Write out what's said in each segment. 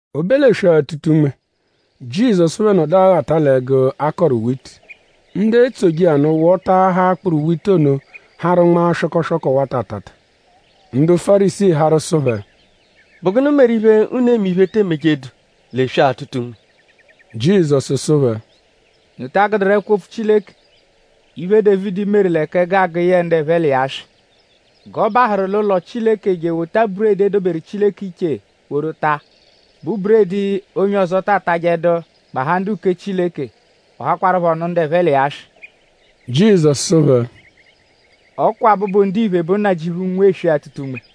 O be l'eswe-atụta-unme; Jizọsu phẹ nọdu aghata l'ẹgu, a kọru witi; ndu etsoje iya nụ wọtaahaa akpụru witi ono harụ nmaa swọkoswoko wata atata. Ndu Fárisii harụ sụ phẹ: “?Bụ gụnu meru iphe unu eme iphe, e te emejedu l'eswe-atụta-unme?” Jizọsu sụ phẹ: “?Unu ta agụduru l'ẹkwo-opfu Chileke iphe, Dévidi meru l'ẹka ẹgu agụ yẹe ndu ẹphe l'iya swị. G'ọ bahụru l'ụlo Chileke je ewota buredi, e doberu Chileke iche woru taa, bụ buredi, onye ọzo ta atajẹdu; gbahaa ndu-uke Chileke. Ọ hakwarụpho nụ ndu ẹphe l'iya swị?” Jizọsu sụ phẹ: “Ọ kwa Abụbu-Ndiphe bụ Nnajịuphu, nwe eswe-atụta-unme.”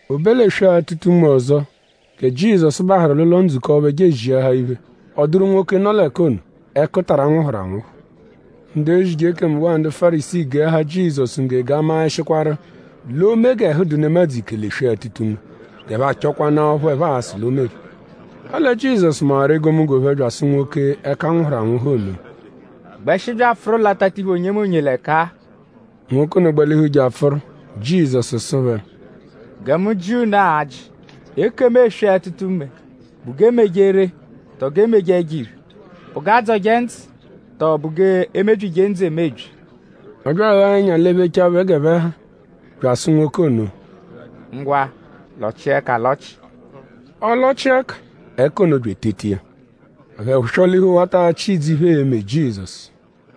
O be l'eswe-atụta-unme ọzo gẹ Jizọsu bahụru l'ụlo-ndzukọ phẹ je eziahaa iphe; ọ dụru nwoke, nọ l'ẹka ono, ẹkutara nwụhuru anwụhu. Ndu ezije ekemu waa ndu Fárisii geahaa Jizọsu ngge g'a maẹshikwaru:?l'oo-me g'ẹhu dụ nemadzụ ike l'eswe-atụta-unme; g'ẹphe achọkwanaa ọphu ẹphe a-sụ l'o meru. Ọle Jizọsu mawaru egomunggo phẹ bya asụ nwoke, ẹka nwụhuru anwụhu ono: “Gbẹshi bya apfụru l'atatiphu onyemonye l'ẹka-a!” Nwoke ono gbalihu je apfụru. Jizọsu sụ phẹ: “Gẹ mu jịa unu ajị. Ekemu eswe-atụta-unme?bụ g'e meje ree; tọo g'e meje ẹjo-iphe??Bụ g'a dzọje ndzụ; tọo bụ g'e mebyije ndzụ emebyi?” Ọ bya aghaa ẹnya lephechaa phẹ g'ẹphe ha bya asụ nwoke ono: “Ngwa; lọchia ẹka alọchi!” Ọ lọchia ẹka. Ẹka ono bya eteta iya. Ẹphe swọ-lihu wata achị idzu iphe, ee-me Jizọsu.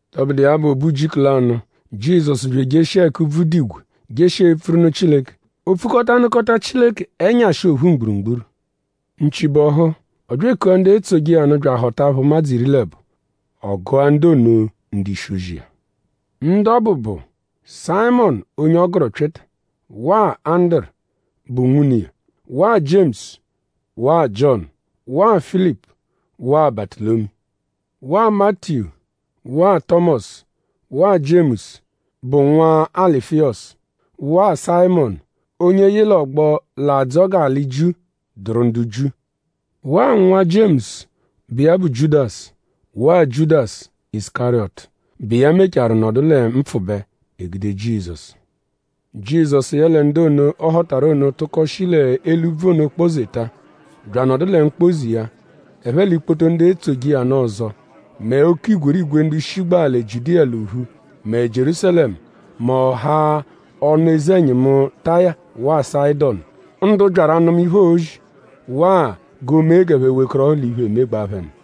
Tọbudu iya bụ; o be ujiku lanụ; Jizọsu bya ejeshia ẹka úbvú dụ igwe; jeshia epfuru nụ Chileke. O pfukọta nụkota Chileke ẹnyashi ophu mgburugburu. Nchi bọhu; ọ bya ekua ndu etsoje iya nụ bya ahọta phẹ ụmadzu iri l'ẹbo. Ọ gụa ndu ono ndu-ishi-ozi iya. Ndu ọ bụ bụ: Sayịmonu onye ọ gụru Pyịta; waa Anduru, bụ nwune iya; waa Jiemusu; waa Jiọnu; waa Filipu; waa Batụlomiyu; waa Matiyu; waa Tọmosu; waa Jiemusu, bụ nwa Alufiyọsu; waa Sayịmonu, onye yị l'ọgbo, l'adzọ g'alị Jiu dụru ndu Jiu; waa nwa Jiemusu, bụ iya bụ Jiudasu; waa Jiudasu Isukariyọtu, bụ iya mecharu nọdu lẹ mpfụbe; e gude Jizọsu. Jizọsu yẹle ndu ono, ọ họtaru ono tụko shi l'eli úbvú ono kpọ-zeta; bya anọdu lẹ mkpọ-ze iya; ẹphe l'ikpoto ndu etsoje iya nụ ọzo; mẹ oke igwerigwe ndu shigbaa lẹ Jiudiya l'ophu; mẹ Jierúsalẹmu; mẹ ọha ọnu-eze-ẹnyimu Taya waa Sayịdonu; ndu byaru anụma iphe, oo-zi; waa g'o mee g'ẹphe wekọrohu l'iphe, emegbaa phẹ nụ.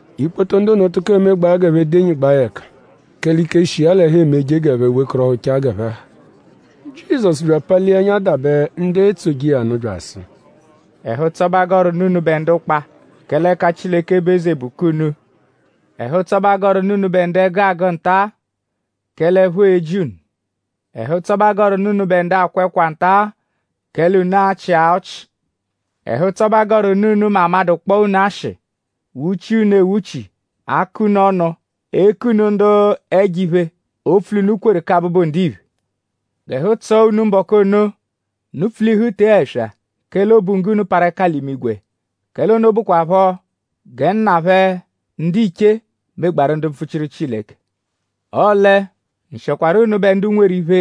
Ikpoto ndu ono tụko emegbaa g'ẹphe denyigbaa ya ẹka; kẹle ike, shi iya l'ẹhu emeje g'ẹphe wekọrohuchaa g'ẹphe ha. Jizọsu bya apalia ẹnya dabẹ ndu etsoje iya nụ bya asụ: “Ẹhu-ụtso bẹ a gọru nụ unubẹ ndu ụkpa; kẹle ẹka Chileke bụ eze bụ k'unu. Ẹhu-ụtso bẹ a gọru nụ unubẹ ndu ẹgu agụ nta; kẹle ẹpho e-ji unu. Ẹhu-ụtso bẹ a gọru nụ unubẹ ndu akwa ẹkwa nta; kẹle unu a-chịa ọchi. “Ẹhu-ụtso bẹ a gọru nụ unu mẹ amadụ -kpọo unu ashị; wuchia unu ewuchi; akọ unu ọnu; eku unu ndu ẹjo-iphe opfu l'unu kweru kẹ Abụbu-Ndiphe. G'ẹhu tsọo unu mbọku ono; unu pfulihu tee ẹswa; kẹle obunggo unu parụ ẹka l'imigwe; kẹle ono bụkwapho gẹ nna phẹ ndiche megbaaru ndu mpfuchiru Chileke. “Ọle; nshịokwaro unubẹ ndu nweru iphe;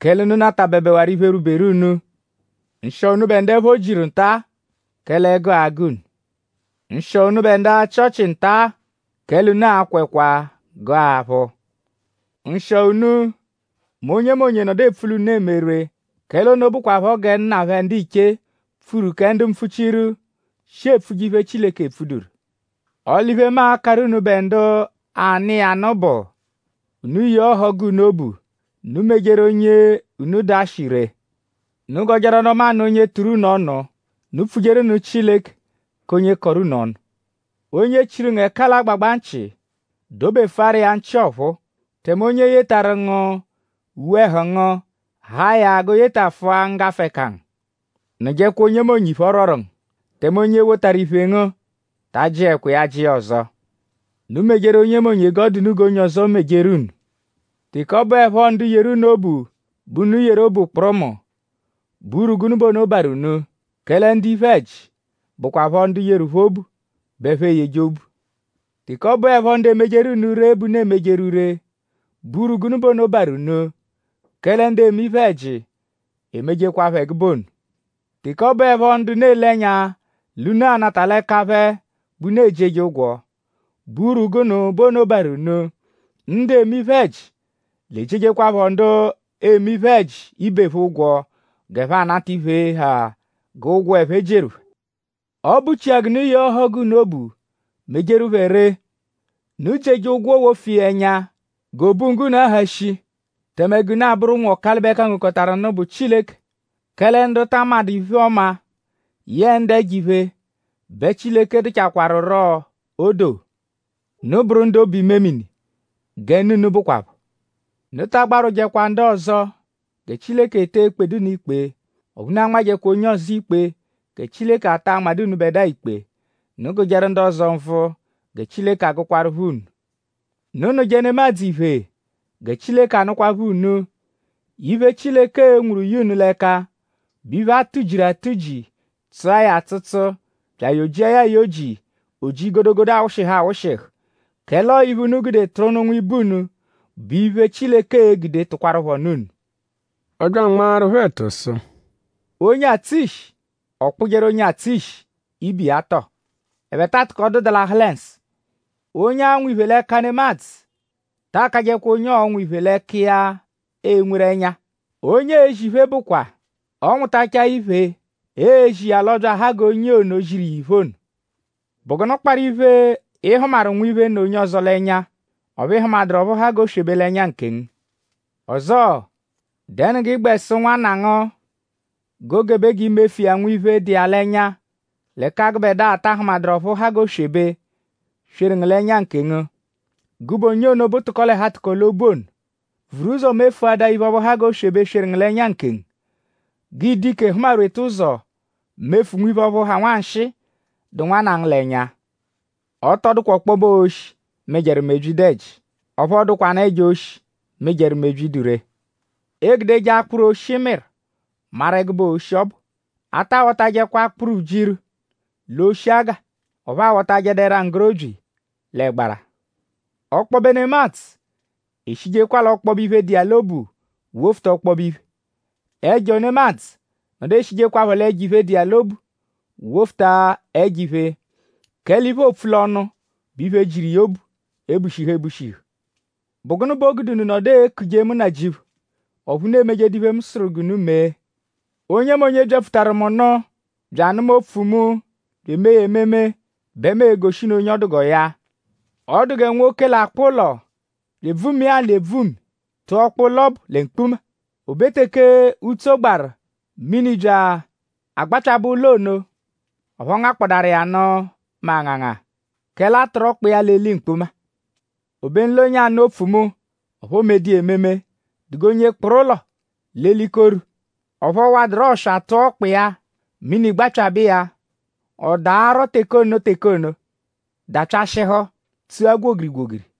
kẹle unu natabẹbewaru iphe, rwuberu unu. Nshịo unubẹ ndu ẹpho jiru nta-a; kẹle ẹgu a-gụ unu. Nshịo unubẹ ndu achị ọchi nta; kẹle unu a-kwa ẹkwa gụa aphụ. “Nshịo unu; mẹ onyemonye -nọdu epfu l'unu eme ree; kẹle ono bụkwapho gẹ nna phẹ ndiche pfuru kẹ ndu mpfuchiru, shi epfuje iphe, Chileke epfuduru.” “Ọle iphe, mu a-karụ unubẹ ndu anụ iya nụ bụ: Unu yee ọhogu unu obu; unu mejeru onye unu dụ ashị ree. Unu gọjeru ọnu-ọma nụ onye tụru unu ọnu. Unu pfujeru nụ Chileke k'onye kọru unu ọnu. Onye chiru ngu ẹka l'agbagba nchị; dobefụaru iya nchị ọphuu; tẹme onye yetarụ ngu uwe-ẹhu ngu; haa ya g'o yetafụa nggafụ-ẹka ngu. Nụjekwa onyemonye iphe ọ rwọru ngu; tẹme onye wotaru iphe ngu; ta ajịekwa iya ajị iya ọzo. Unu mejeru onyemonye g'ọ dụ unu g'onye ọzo mejeru unu. “Teke ọ bụepho ndu yeru unu obu bẹ unu yeru obu kpụrumu;?bụ urwu gụnu bẹ ono barụ unu? Kẹle ndu iphe-ẹji bụkwapho ndu yeru phẹ obu bẹ ẹphe eyeje obu. Teke ọ bụepho ndu emejeru unu ree bẹ unu emejeru ree;?bụ urwu gụnu bẹ ono barụ unu? Kẹle ndu eme iphe-ẹji emejekwaphọ ẹgube ono. Teke ọ bụepho ndu unu ele ẹnya l'unu a-nata l'ẹka phẹ bẹ unu ejieje ụgwo;?bụ urwu gụnu bẹ ono barụ unu? Ndu eme iphe-ẹji l'ejiejekwaphọ ndu eme iphe-ẹji ibe phẹ ụgwo g'ẹphe anata iphe, ha g'ụgwo, ẹphe jieru phẹ. Ọ bụchia g'unu yee ọhogu unu obu; mejeru phẹ ree. Unu jieje ụgwo wofu iya ẹnya g'obunggo unu aha shii; tẹme g'unu abụru ụnwu Ọkalibe-kangokọtaru-nụ, bụ Chileke; kẹle ndu ta amadụ iphe-ọma yẹe ndu ẹjo-iphe bẹ Chileke dụchakwaruro odoo. Unu bụru ndu obu-imemini gẹ Nna unu bụkwapho. “Unu ta agbarwụjekwa ndu ọzo; gẹ Chileke etee ekpedu unu ikpe; ọphu unu anmajẹkwa onye ọzo ikpe; gẹ Chileke ataa anmadụ unubẹdua ikpe. Unu gụjeru ndu ọzo nvụ gẹ Chileke a-gụkwaarupho unu. Unu nụje nemadzụ iphe gẹ Chileke a-nụkwapho unu. Iphe, Chileke e-nwuru ye unu l'ẹka bụ iphe, a tụ-jiru atụ-ji; tsụa ya atsụtsu; bya ayọ-jia ya ayọ-ji; o ji godogodo awụshihu awụshihu. Kẹle ọo iphe, unu gude tụru nụ nwibe unu bụ iphe, Chileke e-gude tụkwarupho nụ unu.” Ọ bya anmaaru phẹ ẹtu sụ: “Onye atsụ ishi?ọ kpụjeru onye atsụ ishi ibe iya tọo??Ẹphe taa atụkodu dalahụ lẹ nsụ?” Onye anwụ iphe l'ẹka nemadzụ ta akajẹkwa onye ọonwu iphe l'ẹka iya enweru ẹnya. Onye eezi iphe bụkwa; ọ -nwụtachaa iphe, eezi iya l'ọo-bya aha g'onye ono, ziru iya iphe ono. “?Bụ gụnu kparụ iphe, ị hụmaru nwiphe, nọ onye ọzo l'ẹnya; ọphu ị hụmaduru ọphu ha g'oswebe l'ẹnya nkengu? Ọzoo;?dẹnu g'ịi-gbẹ sụ nwanna ngu g'o gebe g'i mefu iya nwiphe, dụ iya l'ẹnya; l'ẹka gụbedua ata ahụmaduru ọphu ha g'oswebe, sweru ngu l'ẹnya nkengu? Gụbe onye ono bụ tụko-l'ẹhu-atụko-l'obu ono! Vuru ụzo mefuadaa iphe ọphu ha g'oswebe, sweru ngu l'ẹnya nkengu; g'ịi-dụ ike hụma-rweta ụzo; mefu nwiphe ọphu ha nwanshịi, dụ nwanna ngu l'ẹnya.” “Ọ tọ dụkwa ọkpobe oshi, mịjeru mebyi dụ ẹji; ọphu ọ dụkwanu ẹjo oshi, mịjeru mebyi, dụ ree. Eegudeje akpụru, oshi mịru maru ẹgube oshi, ọ bụ. A ta awọtajekwa akpụru ujiru l'oshi aga; ọphu a wọtajedu ẹra-nggorobyi l'ẹgbara. Ọkpobe nemadzụ eshijekwa l'ọkpobe iphe, dụ iya l'obu; wofuta ọkpobe iphe. Ẹjo nemadzụ nọdu eshijekwaphọ l'ẹjo-iphe, dụ iya l'obu; wofuta ẹjo-iphe. Kẹle iphe, oopfu l'ọnu bụ iphe, jiru iya obu ebushihu ebushihu.” “?Bụ gụnu bẹ o gude unu nọdu ekuje mu Nnajịuphu; ọphu unu emejedu iphe, mu sụru g'unu mee? Onyemonye, byapfutaru mu nụ; bya anụma opfu mu bya eme iya ememe bẹ mu e-goshi unu onye ọ dụ g'ọo ya. Ọ dụ gẹ nwoke, l'akpụ ụlo bya ebvumia alị ebvumi; tụa ọkpa ụlo ọbu lẹ mkpuma. O be teke utso gbaru; mini bya agbapyabẹ ụlo ono; ọphu ọ ngakpọdaaru iya nụ mẹ anganga; kẹle a tụru ọkpa iya l'eli mkpuma. Obenu l'onye anụ opfu mu; ọphu o medu iya ememe dụ g'onye kpụru ụlo l'elikoru; ọphu ọ waduru ọswa tụa ọkpa iya; mini gbapyabẹ iya; ọ daarọ teke ono teke ono dapyashịhu; tsua gwogiri-gwogiri.”